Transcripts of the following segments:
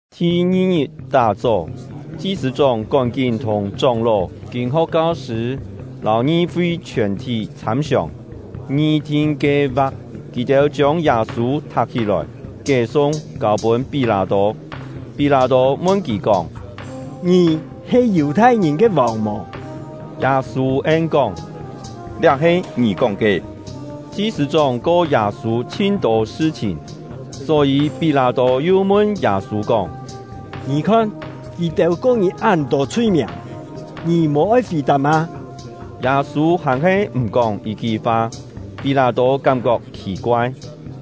Thi-ngi-ngit tá-chó, chi-sṳ̂-chóng kón-kín thùng chóng-ló, kîn-ho̍k kau-sṳ̂, lâu ngi-fi chhiòn-thí chhâm-siòng, ngi-thin kie-va̍k. Kì-têu chiông Yâ-sû thak-hí-lòi, kié-sung, kâu-pûn Pí-lâ-tô. Pí-lâ-tô mun kì kóng: “Ngì he Yù-thai-ngìn ke vòng mò?” Yâ-sû en-kóng: “Liá he ngì kóng ke.” Chi-sṳ̂-chóng ko Yâ-sû chhin-tô sṳ-chhìn, só-yî Pí-lâ-tô yu mun Yâ-sû kóng: “Ngì khon, kì-têu ko ngì án-tô chhui-miàng, ngì mò-oi fì-tap mâ?” Yâ-sû hàn-he m̀ kóng yit-ki fa; Pí-lâ-tô kám-kok khì-koai.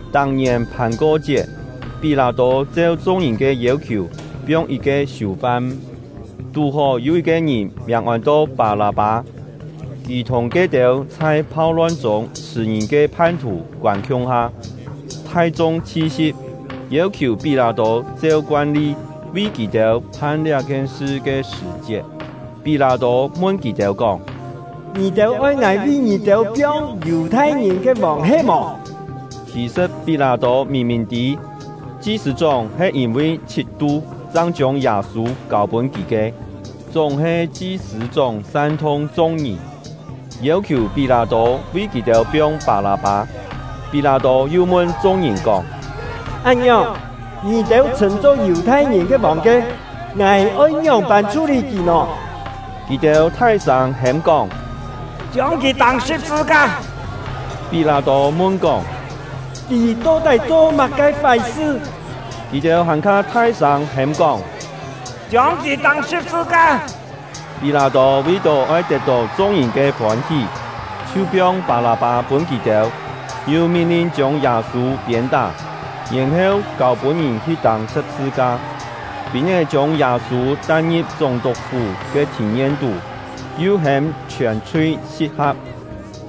Tak-ngièn Phàn-ko-chiet, Pí-lâ-tô cheu chung-ngìn ke yêu-khiù piong yit-ke siù-fam. Tú-hó yû yit-ke ngìn miàng ôn-to Pâ-lâ-pâ, kì thùng ke-têu chhai phau-lon-chûng chhṳ̀-ngìn ke phan-thù koân khiung-ha. Thai-chung chhi-si̍p, yêu-khiù Pí-lâ-tô cheu koan-li vi kì-têu phan liá-khien sṳ ke sṳ̀-chiet, Pí-lâ-tô mun kì-têu kóng: “Ngì-têu oi ngài vi ngì-têu piong Yù-thai-ngìn ke vòng he-mò?” Khì-sṳ̍t Pí-lâ-tô mìn-mìn tî, chi-sṳ̂-chóng he yîn-vi chhit-tu chang chiông Yâ-sû kâu-pûn kì ke. Chúng-he chi-sṳ̂-chóng san-thung chung-ngìn, yêu-khiù Pí-lâ-tô vi kì-têu piong Pâ-lâ-pâ. Pí-lâ-tô yu mun chung-ngìn kóng: “Án-ngiòng, ngì-têu chhṳ̂n-cho Yù-thai-ngìn ke vòng ke, ngài oi ngióng-pân chhú-lî kì nò?” Kì-têu thai-sâng hêm-kóng: “Chiông kì tâng sṳ̍p-sṳ-ka!” Pí-lâ-tô mun-kóng: “Kì to-tái cho má-ke fái-sṳ?” Kì-têu hàn-kha thai-sâng hêm-kóng: “Chiông kì tâng sṳ̍p-sṳ-ka!” Pí-lâ-tô vi-tó oi tet-tó chung-ngìn ke fôn-hí, chhiu piong Pâ-lâ-pâ pûn kì-têu, yu min-lin chiông Yâ-sû piên-tá, yèn-heu kâu-pûn ngìn hi tâng sṳ̍p-sṳ-ka. Pîn-é chiông Yâ-sû tai-ngi̍p chúng-tuk-fú ke thìn-yen-tú, yu hêm chhiòn-chhui si̍p-ha̍p.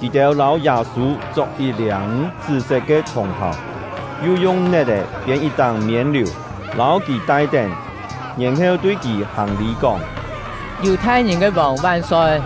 Kì-têu lâu Yâ-sû chok yit-liâng chṳ́-set ke chhòng-phàu, yu yung net-è phiên yit-táng miên-liù, lâu kì tai-tén, yèn-heu tui kì hàng-lî kóng: “Yù-thai-ngìn ke vòng van-soi!”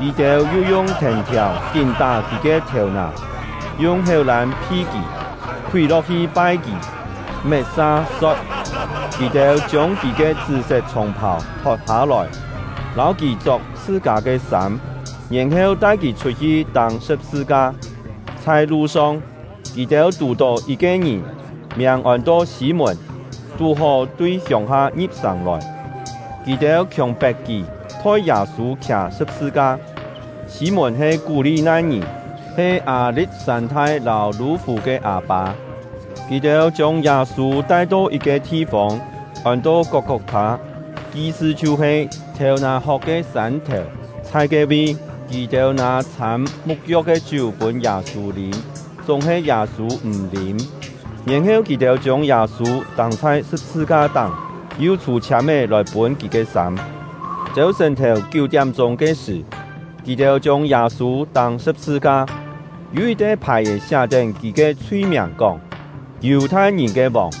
Kì-têu yu yung thèn-thiàu kín tá kì ke thèu-nà, yung héu-lân phi kì, khúi lo̍k-hi pai kì. Met-sa so̍t, kì-têu chiông kì ke chṳ́-set chhòng-phàu thot-hâ-lòi, lâu kì chok chhṳ-kâ ke sâm, yèn-heu tai kì chhut-hi tâng sṳ̍p-sṳ-ka. Chhai lu-song, kì-têu tù-tó yit-ke ngìn, miàng ôn-to Sî-mùn, tú-hó tui hiông-ha ngi̍p-sàng lòi, kì-têu khiòng-pet kì thoi Yâ-sû khià sṳ̍p-sṳ-ka. (Sî-mùn he Kú-li-nai-ngìn, he Â-li̍t-sân-thai lâu Lû-fù ke â-pâ.) Kì-têu chiông Yâ-sû tai-to yit-ke thi-fông, ôn-to Kok-kok-thâ, yi-sṳ chhiu-he “Thèu-nà-hok ke Sân-thèu”. Chhai ke-vi, kì-têu nâ chhâm mu̍t-yo̍k ke chiú pûn Yâ-sû lîm, chúng-he Yâ-sû m̀ lîm. Yèn-heu kì-têu chiông Yâ-sû tâng chhai sṳ̍p-sṳ-ka-táng, yu chhû-chhiâm-é lòi pûn kì ke sâm. Chêu-sṳ̀n-thèu kiú-tiám-chûng ke sṳ̀, kì-têu chiông Yâ-sû tâng sṳ̍p-sṳ-ka. Yû yit-te phài-è siá-tén kì ke chhui-miàng kóng: “Yù-thai-ngìn ke vòng.”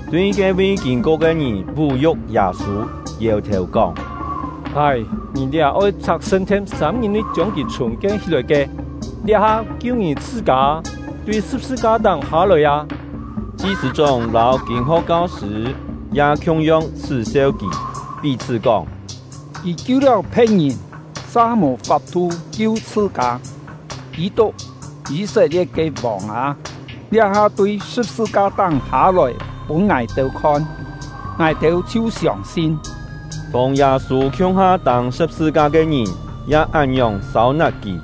Tui ke-vi kîn-ko ke ngìn vú-yu̍k Yâ-sû, yèu-thèu kóng: “Hái, ngì liá oi chhak sṳn-thien, sâm-ngit-nui chiông kì chhùng-kien hí-lòi ke! Liá-ha, kiu ngì chhṳ-kâ, tui sṳ̍p-sṳ-ka-táng hâ-lòi â!” Chi-sṳ̂-chóng lâu kîn-ho̍k kau-sṳ̂ ya khiung-yong chhṳ́-seu kì, pí-chhṳ́ kóng: “Kì kiu-liáu phe̍t-ngìn, sa mò fap-thu kiu chhṳ-kâ! Kî-tuk, Yî-set-lie̍t ke vòng â, liá-ha tui sṳ̍p-sṳ-ka-táng hâ-lòi pûn ngài-têu khon, ngài-têu chhiu siông-sin!” Thùng Yâ-sû khiung-ha tâng sṳ̍p-sṳ-ka ke ngìn ya án-ngiòng sâu-nat kì.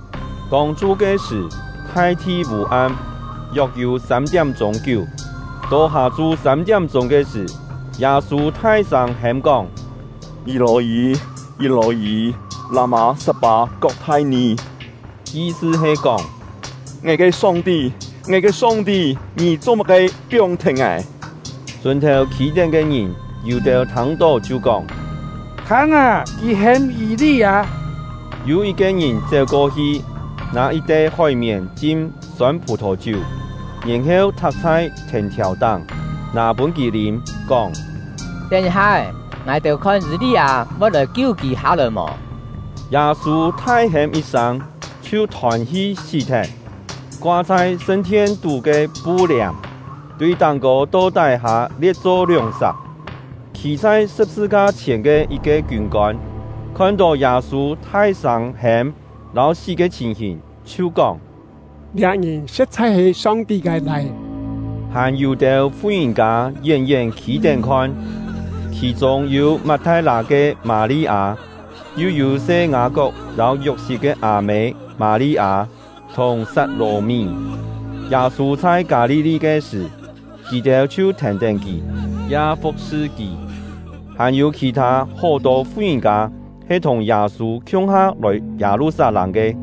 Tông-chu ke sṳ̀, thai-thi vû-am, yok-yû sâm-tiám-chûng kiú. To hâ-chu sâm-tiám-chûng ke sṳ̀, Yâ-sû thai-sâng hêm-kóng: “Yî-lò-yî! Yî-lò-yî! Lâ-mâ sat-pâ-kok-thai-nì?” Yi-sṳ he kóng: “Ngài ke Song-ti, ngài ke Song-ti, Ngì cho-má-ke piong-thet ngài?” Sùn-thèu khî-tén ke ngìn, yû-têu thâng-tó chhiu kóng: “Thâng â, kì hêm Yî-li-â!” Yû yit-ke ngìn chéu-ko-hi, nâ yit-te hói-mièn chim sôn phù-thò-chiú, yèn-heu thak chhai thèn-thiàu-táng, nâ pûn kì lîm, kóng: “Tén yit-ha-é, ngài-têu khon Yî-li-â voi lòi kiu kì hâ-lòi mò!” Yâ-sû thai-hêm yit-sâng, chhiu thôn-hi sí-thet. Koa chhai sṳn-thien-tú ke pu-liàm, tui táng-kô to tái-hâ lie̍t-cho lióng-sak. Khî chhai sṳ̍p-sṳ-ka chhièn ke yit-ke kiûn-kôn, khon-tó Yâ-sû thai-sâng hêm lâu Yû-têu kú-kién mò “thai-sâng hêm lâu”. sí ke chhìn-hìn, chhiu kóng: “Liá ngìn sṳ̍t-chhai he Song-ti ke Lai-é!” Hàn yû-têu fu-ngìn-kâ yén-yén khî-tén khon; khì-chûng yû Mat-thai-lâ ke Mâ-li-â, yu yû se Ngâ-kok lâu Yok-sit ke â-mê Mâ-li-â, thùng Sat-lò-mí. Yâ-sû chhai Kâ-li-li ke sṳ̀, kì-têu chhiu thèn-tén kì, ya fu̍k-sṳ kì. Hàn-yû khì-thâ hó-tô fu-ngìn-kâ he thùng Yâ-sû khiung-ha lòi Yâ-lu-sat-lâng ke.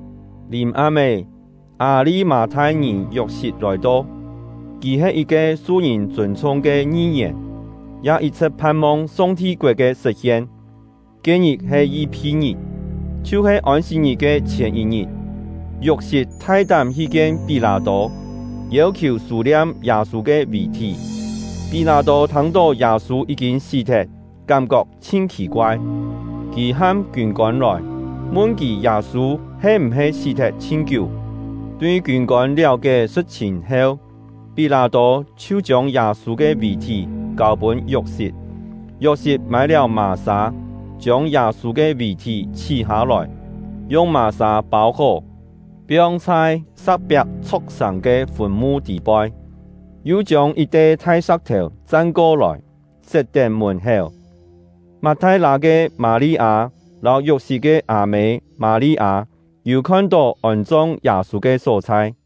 Lìm-am-é, Â-li-mâ-thai-ngìn Yok-sit lòi-to; kì he yit-ke su-ngìn chûn-chhung ke ngi-yèn, ya yit-chhṳ̍t phan-mong Song-ti koet ke sṳ̍t-hien. Ke-ngit he Yi-phi-ngit, chhiu-he Ôn-sit-ngit ke chhièn yit-ngit. Yok-sit thai-tám hi kien Pí-lâ-tô, yêu-khiù sû-liam Yâ-sû ke vì-thí. Pí-lâ-tô thâng-tó Yâ-sû yí-kîn sí-thet, kám-kok chhin khì-koai. Kì ham kiûn-kôn lòi, mun kì Yâ-sû he m̀-he sí-thet chhin kiú. Tui kiûn-kôn liáu-kié sṳ̍t-chhìn heu, Pí-lâ-tô chhiu chiông Yâ-sû ke vì-thí kâu-pûn Yok-sit. Yok-sit mâi-liáu mà-sâ, chiông Yâ-sû ke vì-thí chhí-hâ-lòi, yung mà-sâ pâu-hó, piong chhai sa̍k-piak chho̍k-sàng ke fùn-mu tî-poi, yu chiông yit-te thai sa̍k-thèu chan-ko-lòi, set-tén mùn-héu. Mat-thai-lâ ke Mâ-li-â lâu Yok-sit ke â-mê Mâ-li-â yû khon-tó ôn-chong Yâ-sû ke só-chhai.